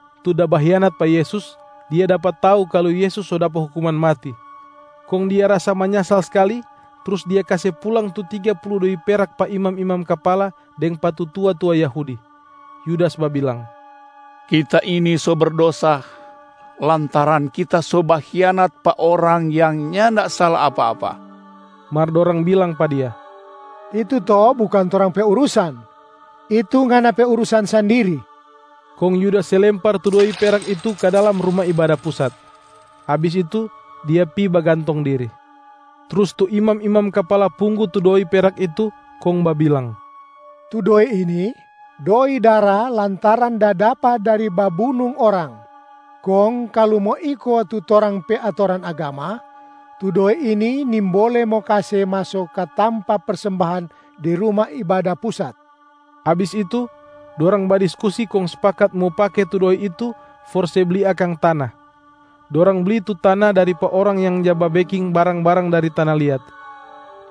Yudas, tu da bahianat pa Yesus, dia dapa tau kalu Yesus so dapa hukuman mati. Kong dia rasa manyasal skali, trus dia kase pulang tu tiga pulu doi peraka pa imam-imam kapala deng pa tu tua-tua Yahudi. Yudas babilang, “Kita ini so berdosa lantaran kita so bahianat pa Orang yang nyanda sala apa-apa.” Mar dorang bilang pa dia, “Itu to bukang torang pe urusan, itu ngana pe urusan sandiri!” Kong Yudas se lempar tu doi perak itu ka dalam Ruma Ibada Pusat. Abis itu dia pi bagantong diri. Trus tu imam-imam kapala punggu tu doi perak itu kong babilang, “Tu doi ini doi dara lantaran da dapa dari babunung orang. Kong kalu mo iko tu torang pe atoran agama, tu doi ini nimbole mo kase maso ka tampa persembahan di Ruma Ibada Pusat.” Abis itu, dorang badiskusi kong spakat mo pake tu doi itu for se bli akang tana. Dorang bli tu tana dari pa orang yang ja babeking barang-barang dari tana liat.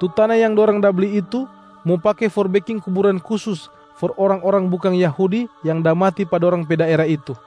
Tu tana yang dorang da bli itu mo pake for beking kuburan kusus for orang-orang bukang Yahudi yang da mati pa dorang pe daera itu.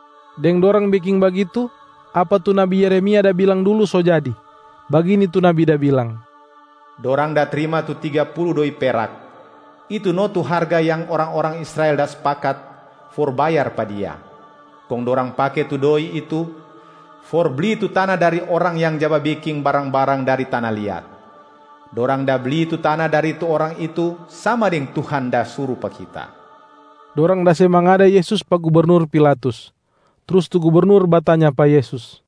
Deng dorang beking bagitu, apa tu nabi Yeremia da bilang dulu so jadi. Bagini tu nabi da bilang, “Dorang da trima tu tiga pulu doi perak, itu no tu harga yang orang-orang Israel da spakat for bayar pa Dia. Kong dorang pake tu doi itu for bli tu tana dari orang yang ja babeking barang-barang dari tana liat. Dorang da bli tu tana dari tu orang itu sama deng Tuhan da suru pa kita.” Dorang da se mangada Yesus pa gubernur Pilatus. Trus tu gubernur batanya pa Yesus,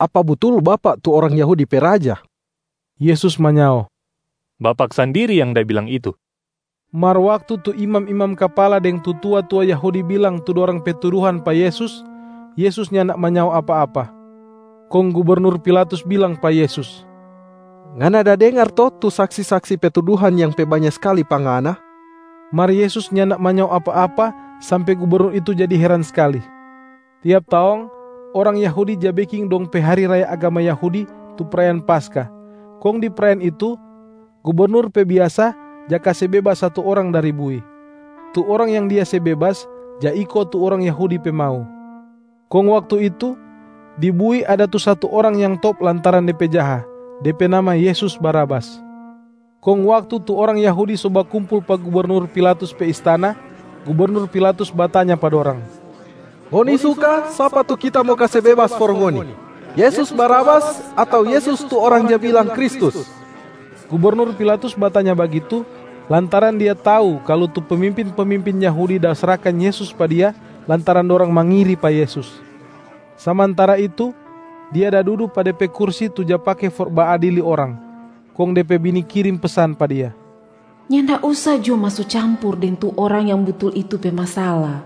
“Apa butul Bapak tu orang Yahudi pe Raja?” Yesus manyao, “Bapak sandiri yang da bilang itu.” Mar waktu tu imam-imam kapala deng tu tua-tua Yahudi bilang tu dorang pe tuduhan pa Yesus, Yesus nyanda manyao apa-apa. Kong gubernur Pilatus bilang pa Yesus, “Ngana da dengar to tu saksi-saksi pe tuduhan yang pe banya skali pa Ngana?” Mar Yesus nyanda manyao apa-apa sampe gubernur itu jadi heran skali. Tiap taong, orang Yahudi ja beking dong pe hari raya agama Yahudi tu prayaan Paskah, kong di prayaan itu gubernur pe biasa ja kase bebas satu orang dari bui. Tu orang yang dia se bebas ja iko tu orang Yahudi pe mau. Kong waktu itu, di bui ada tu satu orang yang top lantaran de pe jaha, de pe nama Yesus Barabas. Kong waktu tu orang Yahudi so bakumpul pa gubernur Pilatus pe istana, gubernur Pilatus batanya pa dorang, “Ngoni suka sapa tu kita mo kase bebas for ngoni, Yesus Barabas ato Yesus tu orang ja bilang Kristus?” Gubernur Pilatus batanya bagitu, lantaran dia tau kalu tu pemimpin-pemimpin Yahudi da srahkan Yesus pa dia lantaran dorang mangiri pa Yesus. Samantara itu, dia da dudu pa de pe kursi tu ja pake for baadili orang, kong de pe bini kirim pesan pa dia, “Nyanda usa jo maso campur deng tu Orang yang butul itu pe masala.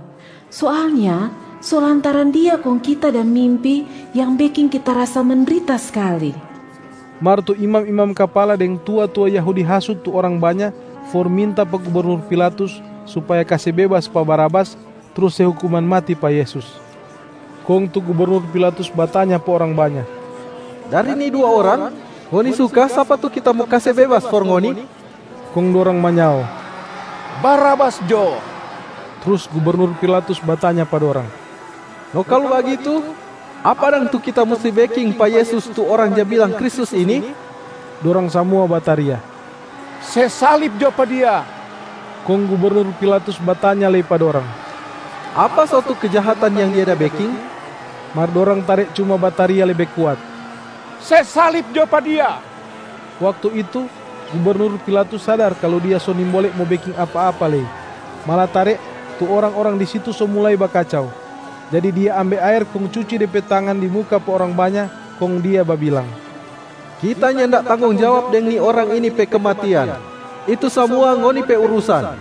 Soalnya so lantaran Dia kong kita da mimpi yang beking kita rasa mendrita skali.” Mar tu imam-imam kapala deng tua-tua Yahudi hasut tu orang banya for minta pa gubernur Pilatus supaya kase bebas pa Barabas trus se hukuman mati pa Yesus. Kong tu gubernur Pilatus batanya pa orang banya, “Dari ni dua orang, ngoni suka sapa tu kita mo kase bebas for ngoni?” Kong dorang manyao, “Barabas jo!” Trus gubernur Pilatus batanya pa dorang, “No kalu bagitu, apa dang tu kita musti beking pa Yesus tu orang ja bilang Kristus ini?” Dorang samua bataria, “Se salib jo pa Dia!” Kong gubernur Pilatus batanya lei pa dorang, “Apa so tu kejahatan yang Dia da beking?” Mar dorang tare cuma bataria lebe kuat, “Se salib jo pa Dia!” Waktu itu, gubernur Pilatus sadar kalu dia so nimbole mo beking apa-apa lei, malatare tu orang-orang di situ so mulai bakacau. Jadi dia ambe aer kong cuci de pe tangan di muka pa orang banya kong dia babilang, “Kita nyanda tanggong jawab deng ni Orang ini pe kematian. Itu samua ngoni pe urusan!”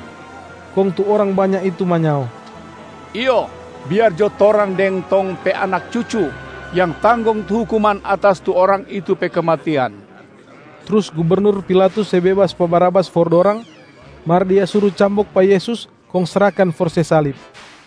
Kong tu orang banya itu manyao, “Iyo, biar jo torang deng tong pe anak cucu yang tanggong tu hukuman atas tu Orang itu pe kematian.” Trus gubernur Pilatus se bebas pa Barabas for dorang, mar dia suru cambok pa Yesus kong srahkan for se salib.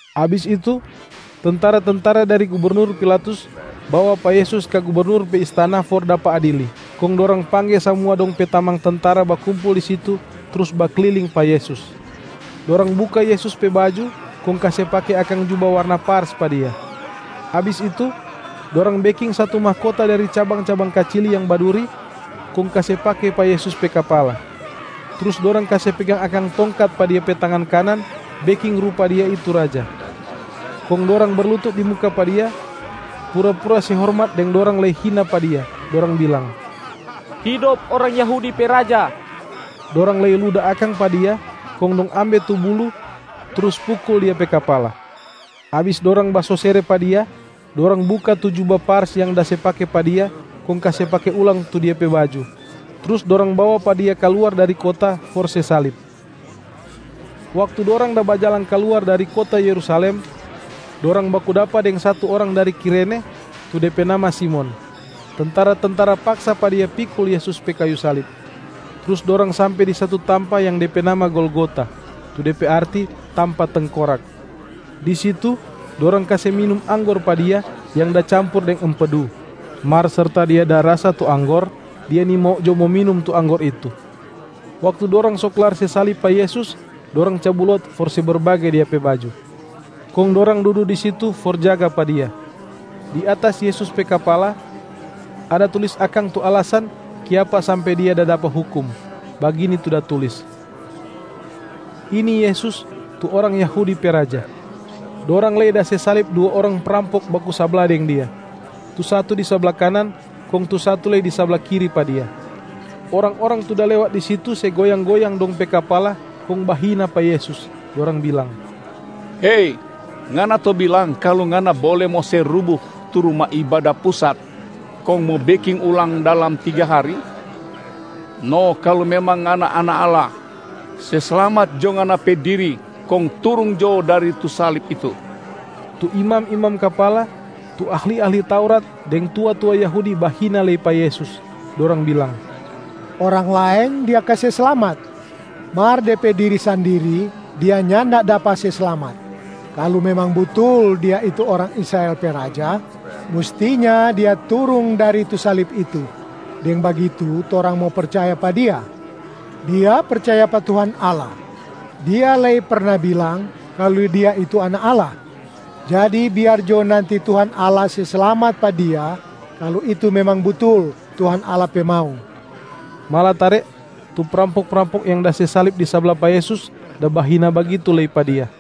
Abis itu, tentara-tentara dari gubernur Pilatus bawa pa Yesus ka gubernur pe istana for dapa adili, kong dorang pangge samua dong pe tamang tentara bakumpul di situ trus bakliling pa Yesus. Dorang buka Yesus pe baju kong kase pake akang juba warna pars pa Dia. Abis itu, dorang beking satu mahkota dari cabang-cabang kacili yang baduri kong kase pake pa Yesus pe kapala. Trus dorang kase pegang akang tongkat pa Dia pe tangan kanan beking rupa Dia itu raja. Kong dorang berlutut di muka pa Dia, pura-pura se hormat deng dorang lei hina pa Dia, dorang bilang, “Hidop orang Yahudi pe raja!” Dorang lei luda akang pa Dia, kong dong ambe tu buluh trus pukul Dia pe kapala. Abis dorang basosere pa Dia, dorang buka tu juba pars yang da se pake pa Dia kong kase pake ulang tu Dia pe baju, trus dorang bawa pa Dia kaluar dari kota for se salib. Waktu dorang da bajalang kaluar dari kota Yerusalem, dorang baku dapa deng satu orang dari Kirene, tu de pe nama Simon. Tentara-tentara paksa pa dia pikul Yesus pe kayu salib. Trus dorang sampe di satu tampa yang de pe nama Golgota, tu de pe arti, ‘Tampa Tengkorak’. Di situ dorang kase minum anggor pa Dia yang da campur deng empeduc. Mar serta Dia da rasa tu anggor, Dia nimau jo mo minum tu anggor itu. Waktu dorang so klar se salib pa Yesus, dorang cabu lot for se berbage Dia pe baju. Kong dorang dudu di situ for jaga pa Dia. Di atas Yesus pe kapala, ada tulis akang tu alasan kiapa sampe Dia da dapa hukum, bagini tu da tulis, ‘Ini Yesus, tu orang Yahudi pe Raja’. Dorang lei da se salib dua orang prampok baku sabla deng Dia. Tu satu di sabla kanan kong tu satu lei di sabla kiri pa Dia. Orang-orang tu da lewat di situ se goyang-goyang dong pe kapala kong bahina pa Yesus, dorang bilang, “Hei, Ngana to bilang kalu Ngana bole mo se rubu tu Ruma Ibada Pusat kong mo beking ulang dalam tiga hari? No kalu memang Ngana Anak Allah, se slamat jo Ngana pe diri kong turung jo dari tu salib itu!” Tu imam-imam kapala, tu ahli-ahli Taurat, deng tua-tua Yahudi bahina lei pa Yesus, dorang bilang, “Orang laeng Dia kase slamat, mar De pe diri sandiri Dia nyanda dapa se slamat! Kalu memang butul Dia itu orang Israel pe Raja, mustinya Dia turung dari tu salib itu, deng bagitu torang mo percaya pa Dia. Dia percaya pa Tuhan Allah. Dia lei perna bilang kalu Dia itu Anak Allah. Jadi biar jo nanti Tuhan Allah se slamat pa Dia kalu itu memang butul Tuhan Allah pe mau.” Malatare tu prampok-prampok yang da se salib di sabla pa Yesus da bahina bagitu lei pa Dia.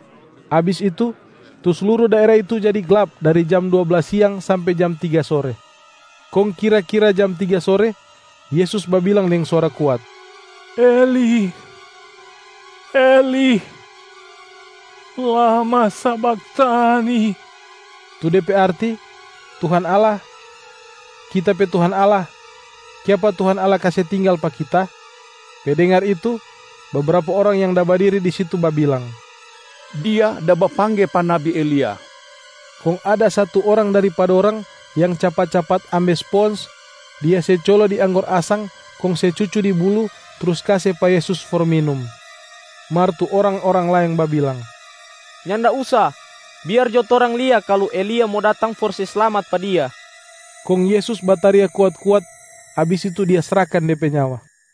Abis itu, tu sluru daera itu jadi glap dari jam dua blas siang sampe jam tiga sore. Kong kira-kira jam tiga sore, Yesus babilang deng suara kuat, “Eli, Eli, lama sabakhtani!” tu de pe arti, ‘Tuhan Allah, Kita pe Tuhan Allah, kiapa Tuhan Allah kase tinggal pa Kita?’ Pe dengar itu, bebrapa orang yang da badiri di situ babilang, “Dia da bapangge pa nabi Elia.” Kong ada satu orang dari pa dorang yang capat-capat ambe spons, dia se colo di anggor asang kong se cucu di buluh trus kase pa Yesus for minum. Mar tu orang-orang laeng babilang, “Nyanda usa! Biar jo torang lia kalu Elia mo datang for se slamat pa Dia.” Kong Yesus bataria kuat-kuat, abis itu Dia srahkan De pe nyawa.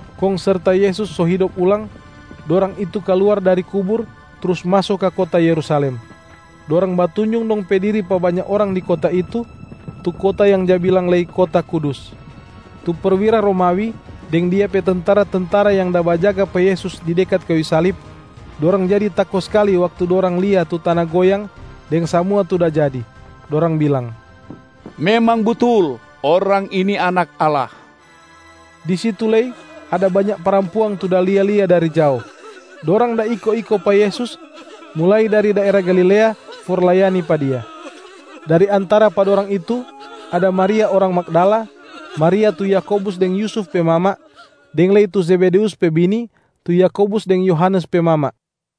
Kong serta Yesus so hidop ulang, dorang itu kaluar dari kubur trus maso ka kota Yerusalem. Dorang batunjung dong pe diri pa banya orang di kota itu, tu kota yang ja bilang lei kota kudus. Tu perwira Romawi deng dia pe tentara-tentara yang da bajaga pa Yesus di dekat kayu salib. Dorang jadi tako skali waktu dorang lia tu tana goyang deng samua tu da jadi. Dorang bilang, “Memang butul, Orang ini Anak Allah!” Di situ lei ada banya parampuang tu da lia-lia dari jao. Dorang da iko-iko pa Yesus mulai dari daera Galilea for layani pa Dia. Dari antara pa dorang itu ada Maria orang Magdala, Maria tu Yakobus deng Yusuf pe mama, deng lei tu Zebedeus pe bini tu Yakobus deng Yohanes pe mama.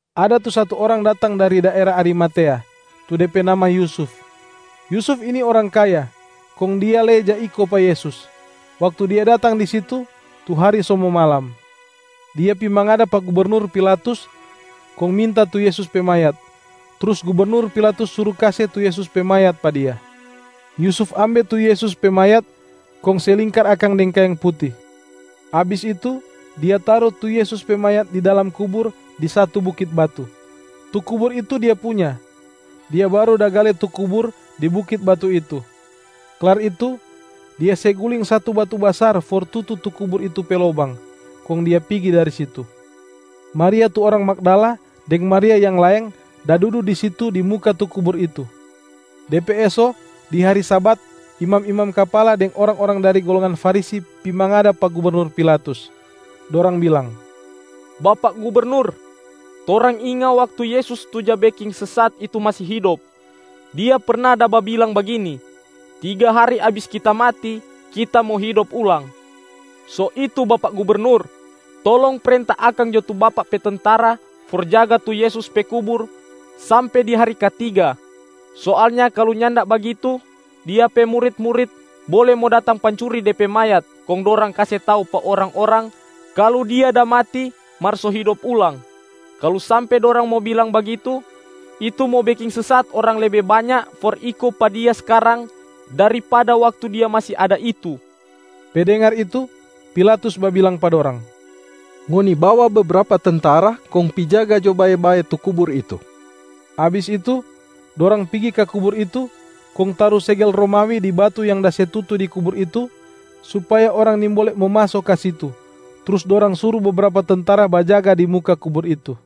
Ada tu satu orang datang dari daera Arimatea, tu de pe nama Yusuf. Yusuf ini orang kaya, kong dia lei ja iko pa Yesus. Waktu dia datang di situ, tu hari so mo malam.d Dia pi mangada pa gubernur Pilatus kong minta tu Yesus pe mayat, trus gubernur Pilatus suru kase tu Yesus pe mayat pa dia. Yusuf ambe tu Yesus pe mayat kong se lingkar akang deng kaeng puti. Abis itu dia taru tu Yesus pe mayat di dalam kubur di satu bukit batu. Tu kubur itu dia punya, dia baru da gale tu kubur di bukit batu itu. Klar itu dia se guling satu batu basar for tutu tu kubur itu pe lobang, kong dia pigi dari situ. Maria tu orang Magdala deng Maria yang laeng da dudu di situ di muka tu kubur itu. De pe eso, di hari Sabat, imam-imam kapala deng orang-orang dari golongan Farisi pi mangada pa gubernur Pilatus. Dorang bilang, “Bapak gubernur, torang inga waktu Yesus tu ja beking sesat itu masi hidop, Dia perna da babilang bagini, ‘Tiga hari abis Kita mati, Kita mo hidop ulang.’ So itu bapak gubernur, tolong prenta akang jo tu bapak pe tentara for jaga tu Yesus pe kubur sampe di hari katiga. Soalnya kalu nyanda bagitu, Dia pe murit-murit bole mo datang pancuri De pe mayat kong dorang kase tau pa orang-orang kalu Dia da mati mar so hidop ulang. Kalu sampe dorang mo bilang bagitu, itu mo beking sesat orang lebe banya for iko pa Dia skarang daripada waktu Dia masi ada itu.” Pe dengar itu, Pilatus babilang pa dorang, “Ngoni bawa bebrapa tentara, kong pi jaga jo bae-bae tu kubur itu.” Abis itu dorang pigi ka kubur itu, kong taru segel Romawi di batu yang da se tutu di kubur itu supaya orang nimbole mo maso ka situ, trus dorang suru bebrapa tentara bajaga di muka kubur itu.